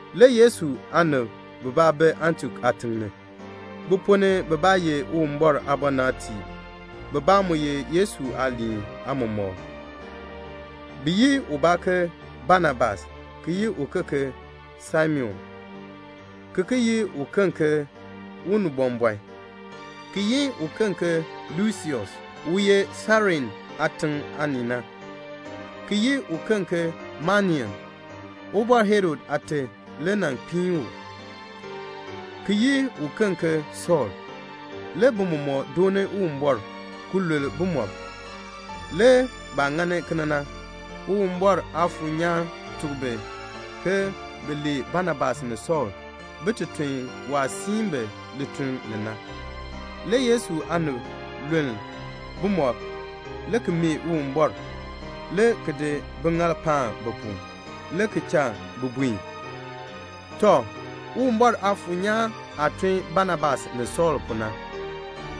Le Yesu aanib bibaa bi Antiok aatiŋ ni. Bi ponn ni bibaa ye Uwumbɔr aabɔnabtiib, bibaa mu ye Yesu aaliin aamɔmɔkb. Bi yi ubaa ke Banabas, ki yi uken ke Simeon (ki ki yi u ke Unibɔmbɔn), ki yi uken ke Lusius u ye Sairene aatiŋ aanii na, ki yi uken ke Manaen (Ubɔr Herod aate le nan kpiin u), ki yi uken ke Sɔɔl. Le bi mɔmɔk dooni Uwumbɔr ki lul bumɔb. Le baah ŋani kena na, Uwumbɔr Aafuur nyaan tuk bi ke bin lee Banabas ni Sɔɔl bin ti tun waah siin bi lituln li na. Le Yesu aanib lul bumɔb, le ki mee Uwumbɔr, le ki di biŋaal paan bi pu, le ki cha bi buen. Tɔ, Uwumbɔr Aafuur nyaan aah tun Banabas ni Sɔɔl pu na,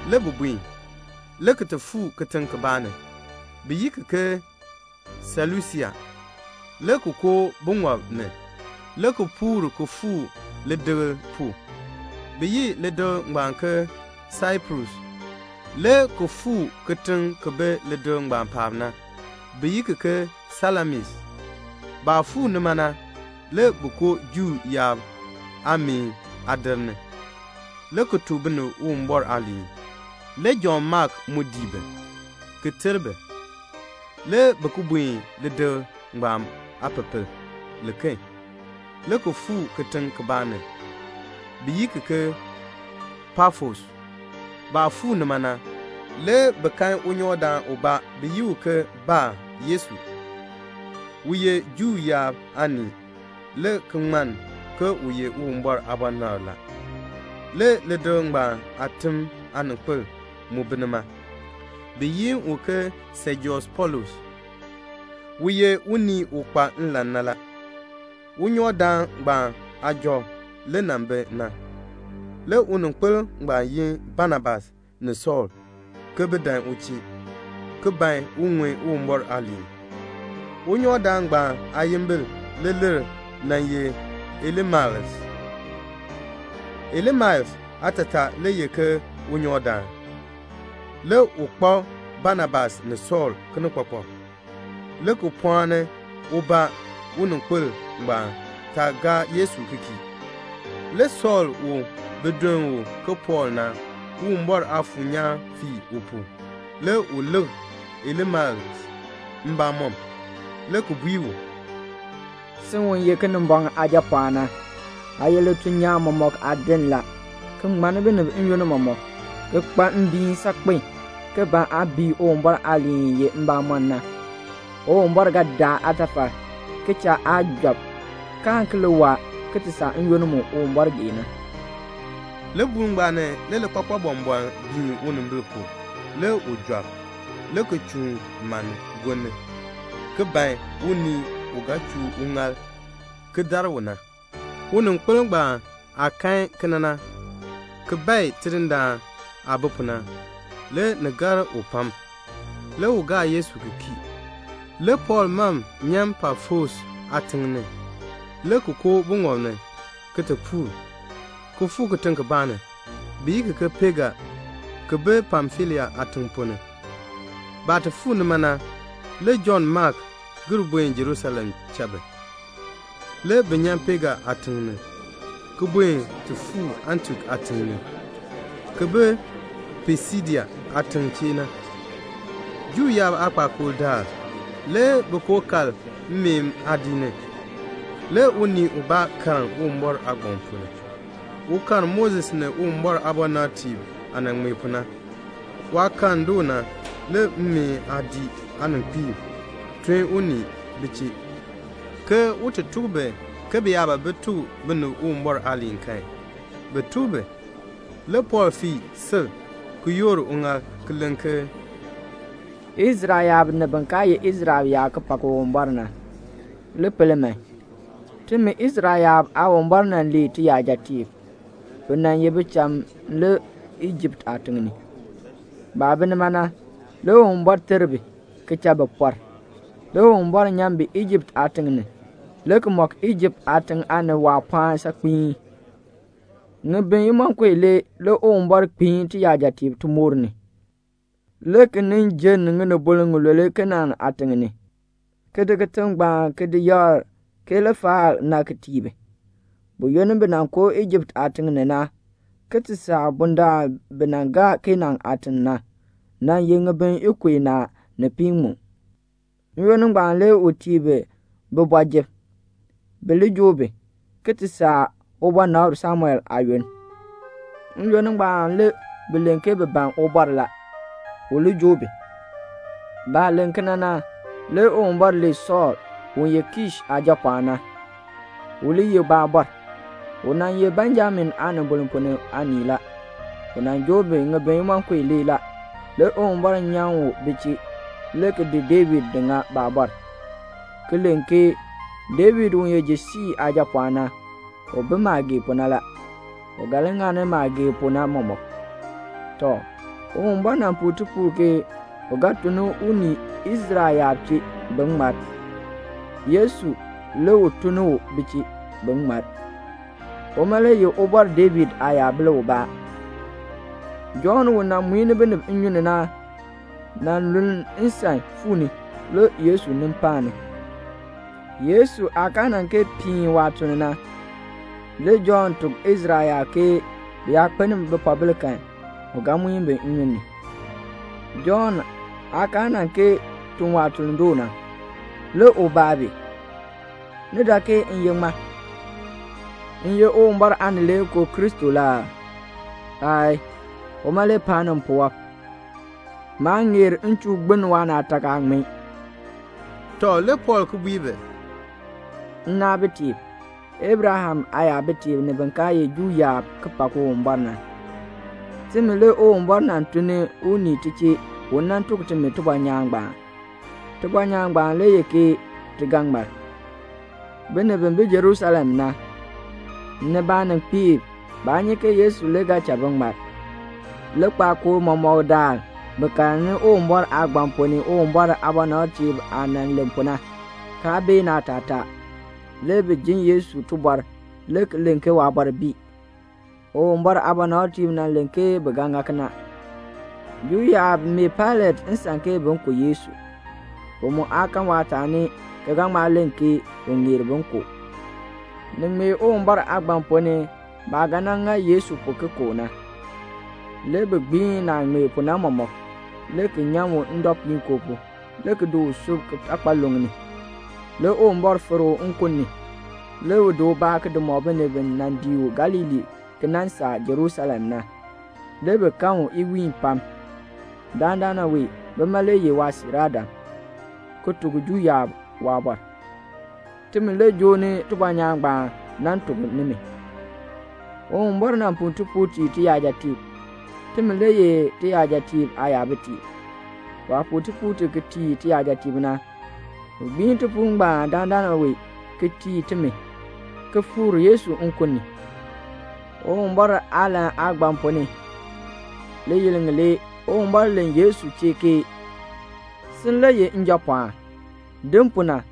le bi buen, le ki ti fuu kitiŋ kibaa ni, bi yi ki ke Selusia, le ki koo buŋɔb ni, le ki puur ki fuu lidikl pu, bi yi lidikl ngbaan ke Saiprus, le ki fuu kitiŋ ki bi lidikl ngbaan paab na, bi yi ki ke Salamis. Baah fuu nima na, le bi koo Juu yaab aameen aadir ni, le ki tuk binib Uwumbɔr aaliin. Le Jɔnn Mak mu dii bi, ki ter bi. Le bi ki buen lidikl ngbaan aapepel liken, le ki fuu kitiŋ kibaa ni, bi yi ki ke Pafos. Baah fuu nima na, le bi kan unyɔkdaan ubaa, bi yi u ke Bar-Yesu. U ye Juu yaab aanii le ki ŋmann ke u ye Uwumbɔr aabɔnabr la. Le lidikl ngbaan aatim aaninkpil mu bi nima, bi yi u ke Sejius Pɔɔlus. U ye unii u kpa nlan na la. Unyɔkdaan ngbaan ujɔ le nan bi na. Le uninkpil ngbaan yin Banabas ni Sɔɔl ke bin dan u chee, ki ban un ŋun Uwumbɔr aaliin. Unyɔkdaan ngbaan aayimbil leeler nan ye Elimas. Elimas aatataa le ye ke unyɔkdaan. Le u kpak Banabas ni Sɔɔl kinikpakpak, le ki pɔɔni ubaa uninkpil ngbaan taa gaa Yesu ki kii. Le Sɔɔl u bi duln u ke Pɔɔl na, Uwumbɔr Aafuur nyaan fir u pu, le u lik Elimas mbamɔm, le ki bui u, "Sin u ye Kinimbɔŋ aajapɔɔn na, aa ye lituln nyaan mɔmɔk aadin la, ki ŋmanni binib n-yoonn mɔmɔk, ki kpa mbiin saakpen, ki ban aa bii Uwumbɔr aaliin i ye mbamɔn na. Uwumbɔr ga daa aatafal, ki cha aa job, kaan ki li waa, ki ti saa n-yoonn mu Uwumbɔr gee na." Libuul ngbaan ni le likpakpal bɔmbɔln biin unimbil pu. Le u job, le ki chuun manni gonni ki ban unii u ga chuu uŋaal ki dar u na. Uninkpil ngbaan aah kan kena na, ki bae Tidindaan aah bi pu na, le ni gar u pam. Le u gaa Yesu ki kii. Le Pɔɔl mam nyan Pafos aatiŋ ni, le ki koo buŋɔb ni, ki ti puur, ki fuu kitiŋ kibaa ni, bi yi ki ke Pega, ki bi Pamfilia aatiŋ ponn ni. Baah ti fuu nima na, le Jɔnn Mak gir buen Jerusalem cha bi. Le bi nyan Pega aatiŋ ni, ki buen ti fuu Antiok aatiŋ ni, ki bi Pisidia aatiŋ chee na. Juu yaab aakpakool daal, le bi koo kal mmeen aadiik ni. Le unii ubaa karn Uwumbɔr aagbaŋ ponn ni. U karn Moses ni Uwumbɔr aabɔnabtiib aah nan ŋmee pu na. Waah karn doo na, le mmeen aadiik aaninkpiib tun unii bi chee, ke un ti tuk bi ke bi yaa ban bin tuk binib Uwumbɔr aaliin kan, bin tuk bi. Le Pɔɔl fii sil ki yoor uŋaal ki len ke "Israel yaab ni bin kaa ye Israel yaab ki pak Uwumbɔr na, li pel man: timi Israel yaab Aawumbɔr nan lee tiyajatiib. Bi nan ye bicham le Ijipt aatiŋ ni. Baah bi nima na, le Uwumbɔr ter bi, ki cha bi pɔr. Le Uwumbɔr nyan bi Ijipt aatiŋ ni, le ki mɔk Ijipt aatiŋ aanib waapɔɔn saakpiin. Ŋibin imonko ilee le Uwumbɔr kpiin tiyajatiib timoor ni, le ki nin jenn ŋinibol ŋilule Kanaan aatiŋ ni, ki di kitiŋ ngbaan ki di yakr ke lifaal na ki tii bi. Buyoonn bi nan koo Ijipt aatiŋ ni na, ki ti saa bundaln bi nan gaa Kanaan aatiŋ na, nan ye ŋibin ikub inaa ni piiŋmu. "N-yoonn ngbaan le u tii bi bibɔjir, bi li joo bi, ki ti saa waabɔnabr Samuel aayoonn. N-yoonn ngbaan le bi len ke bi ban ubɔr la, u li joo bi. Baah len kena na, le Uwumbɔr lee Sɔɔl, u ye Kish aajapɔɔn na, u li ye baabɔr. U nan ye Benjamin aanibol ponn ni aanii la. U nan joo bi ŋibin imonko ilee la. Le Uwumbɔr nyan u bi chee, le ki di David di ŋa baabɔr, le ki len ke, 'David u ye Jese aajapɔɔn na, u bi maah gee pu na la. U ga li ŋani maah gee pu na mɔmɔk.' Tɔ, Uwumbɔr nan puu tipuul ke u ga tun unii Israel yaab chee, bin ŋmar. Yesu le u tun ni u bi chee, bin ŋmar. Uma le ye Ubɔr David aayabil ubaa. Jɔnn u nan muini binib nnyun ni na nan luln nsan fuu ni, le Yesu nin paani. Yesu aah kaa nan kee piin waatuln na, le Jɔnn tuk Israel yaab ke bi yaa kpeln bipoobil kan, u ga di bi ki muin bi nnyun ni. Jɔnn aah kaa nan kee tun waatuln doo na, le u baa bi, 'Ni dak ke m ye ŋmaa? M ye Uwumbɔr Aanileekoo Kristo la aa? Aayii. Uma le paani mpuwɔb. Maa ŋeer m chuu gbiln waanaatak."' Tɔ, le Pɔɔl ki bui bi, "Nnaabitiib, Abraham aayabitiib, ni bin kaa ye Juu yaab ki pak Uwumbɔr na, timi le Uwumbɔr nan tun ni unii ti chee u nan tuk timi tibɔnyaan ngbaan. Tibɔnyaan ngbaan le ye ke ti ga ŋmar. Binib bi bi Jerusalem na, ni baaninkpiib, baa nyi ke Yesu le ga cha bi ŋmar. Likpakool mɔmɔk daal bi karni Uwumbɔr aagbaŋ ponn ni Uwumbɔr aabɔnabtiib aah nan len pu na, kaa bee naatataa. Le bi jin Yesu tibɔr le ki len ke waabɔr bii. Uwumbɔr aabɔnabtiib nan len ke bi ga ŋa kena. Juu yaab mee Pailat nsan ke bin ku Yesu. Bi mu aa kan waataani ki ga ŋma len ke u ŋeer bin ku u. Ni ŋmee Uwumbɔr aagbaŋ ponn ni baah ga nan ŋa Yesu pu ki ku u na. Le bi gbiin naah ŋmee pu na mɔmɔk, le ki nyan u ndɔpuinkoo pu, le ki di u sub kitakpaluŋ ni. Le Uwumbɔr fikr u nkun ni. Le u di ubaa di mɔk binib bi nan dii u Galilee ki nan saa Jerusalem na. Le bi kan u iwiin pam. Dandana wee bima le ye waasiiraadam, ki tuk Juu yaab waabɔr. Timi le joo ni tibɔnyaan ngbaan nan tuk nimi. Uwumbɔr nan puu tipuul tii tiyajatiib. Timi le ye tiyajatiib aayabitiib. Waah puu tipuul ti ki tii tiyajatiib na, u gbiin tipuul ngbaan dandana wee ki tii timi, ki fikr Yesu nkun ni. Uwumbɔr aalahn aagbaŋ ponn ni, liyil ŋilee, le Uwumbɔr len Yesu chee ke 'Sin le ye Njapɔɔn. Din pu na,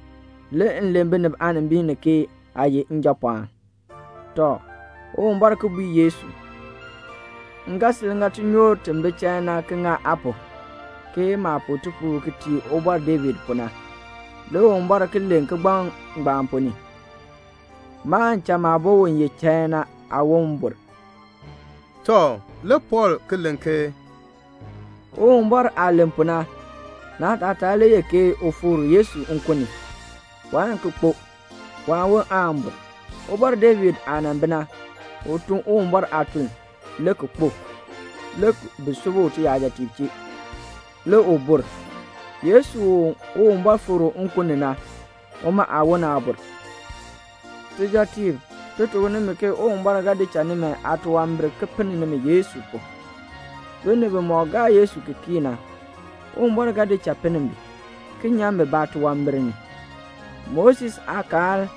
le m len binib aanimbil ni ke aa ye Njapɔɔn.' Tɔ, Uwumbɔr ki bui Yesu: 'M ga sil ŋa tinyoor ti bi chain na ki ŋa aa pu, ke maah puu tipuul ki tii Ubɔr David pu na.' Le Uwumbɔr ki len kigbaŋ ngbaan ponn ni: 'Maan cha maabo u ye chain na aawon bur."' Tɔ, le Pɔɔl ki len ke, "Uwumbɔr aah len pu na, naatataa le ye ke u fikr Yesu nkun ni. Waan ki kpo. Waawon aan bur. Ubɔr David aah nan bi na, u tun Uwumbɔr aatuln, le ki kpo. Le bi sub u uyajatiib chee. Le u bur. Yesu u Uwumbɔr fikr u nkun ni na, uma aawon aa bur. Tijɔtiib, ti tuk nimi ke Uwumbɔr ga di cha nimi aatunwambir ki pinn nimi Yesu pu. Binib bimɔk gaa Yesu ki kii na, Uwumbɔr ga di cha pinn bi, ki nyan bi baatunwambir ni. Moses aakaal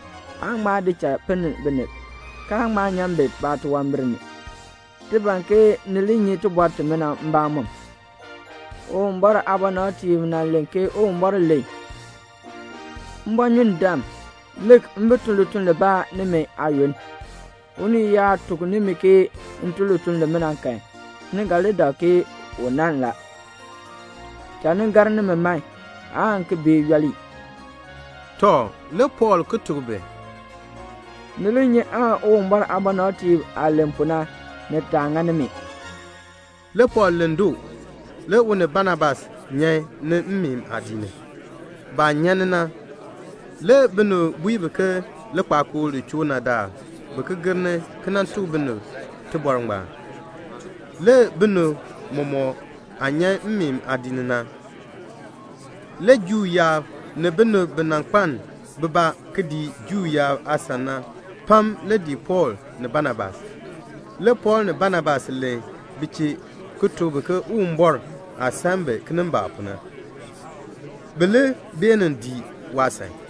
aa ŋma di cha pinn binib, kaa ŋma nyan bi baatunwambir ni. Ti ban ke ni li nyi tibɔr timina mbamɔm. Uwumbɔr aabɔnabtiib nan len ke Uwumbɔr len: 'Mbɔnyundam, lik, m bi tun lituln libaa nimi aayoonn. Unii yaa tuk nimi ke m tun lituln limina kan, ni ga li dak ke u nann la. Cha ni gar nimi man, aan ki bee yooli."' Tɔ, le Pɔɔl ki tuk bi, "Ni li nyi aan Uwumbɔr aabɔnabtiib aah len pu na, ni taa ŋa nimi." Le Pɔɔl len doo. Le u ni Banabas nyan ni mmeen aadiik ni. Baah nyan ni na, le binib bui bi ke likpakool li choo na daal bin ki gir ni, ki nan ki tuk bi tibɔr ngbaan. Le binib mɔmɔk aah nyan mmeen aadiik ni na, le Juu yaab ni binib bi nan kpaln bibaa ki dii Juu yaab aasan na pam le dii Pɔɔl ni Banabas. Le Pɔɔl ni Banabas len bi chee ki tuk bi ke Uwumbɔr aah san bi kinimbaak pu na, bi li beenin dii waasan.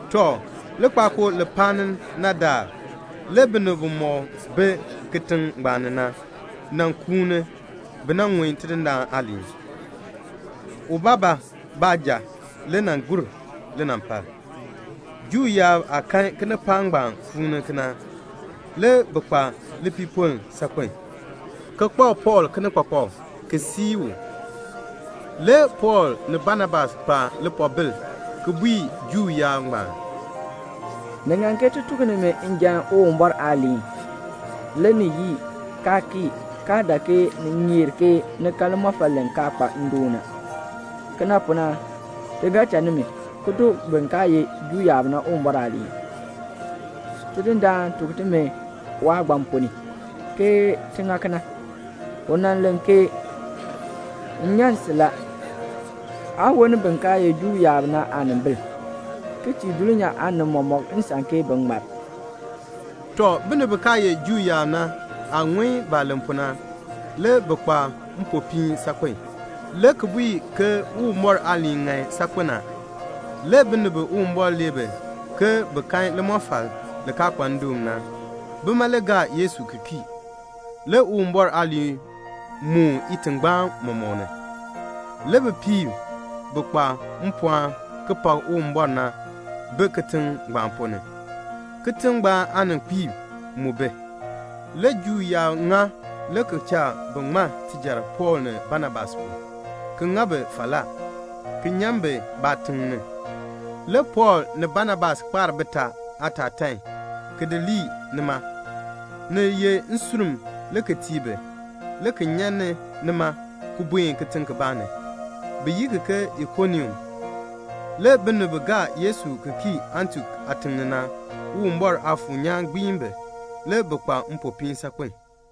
Tɔ, likpakool li paani na daal, le binib bimɔk bi kitiŋ ngbaan ni na, nan kuuni bi nan ŋun Tidindaan aaliin. Ubaabaa baanja le nan gur linampal. Juu yaab aah kan kinipaak ngbaan kuun kena na, le bi kpa lipiipoln saakpen a, ki kpak Pɔɔl kinikpakpak, ki sii u. Le Pɔɔl ni Banabas kpa lipoobil ki bui Juu yaab ngbaan, "Ni ŋan ke ti tuk nimi njan Uwumbɔr aaliin. Le ni yii, kaa kii, kaa dak ke ni ŋeer ni kan limɔfal li kaa kpa ndoon na. Kena pu na, ti ga cha nimi, ki tuk bin kaa ye Juu yaab na Uwumbɔr aaliin. Tidindaan tuk timi waagbaŋ ponn ni, ke ti ŋa kena. U nan len ke 'M nyan si la, aa woln bin kaa ye Juu yaab na aanimbil, ki tii dulnyaa aanib mɔmɔk nsan ke bin ŋmar."' Tɔ, binib bi kaa ye Juu yaab na aah ŋun baah len pu na, le bi kpa mpopiin saakpen, le ki bui ke Uwumbɔr aaliin ŋan saakpen a. Le binib bi Uwumbɔr lee bi ke bin kan limɔfal li kaa kpa ndoon na, bima le gaa Yesu ki kii. Le Uwumbɔr aaliin moon itingbaan mɔmɔk ni. Le bipiib bi kpa mpɔɔn ki pak Uwumbɔr na bi kitiŋ ngbaan ponn ni. Kitiŋ ngbaan aaninkpiib mu bi. Le Juu yaab ŋa le ki cha bi ŋma tijar Pɔɔl ni Banabas pu, ki ŋa bi falaa, ki nyan bi baatiŋ ni. Le Pɔɔl ni Banabas kpaar bitaa aatatan, ki di lii nima, ni ye nsurm le ki tii bi, le ki nyan ni nima, ki buen kitiŋ kibaa ni, bi yi ki ke Ikonium. Le binib bi gaa Yesu ki kii Antiok aatiŋ ni na, Uwumbɔr Aafuur nyaan gbiin bi. Le bi kpa mpopiin saakpen.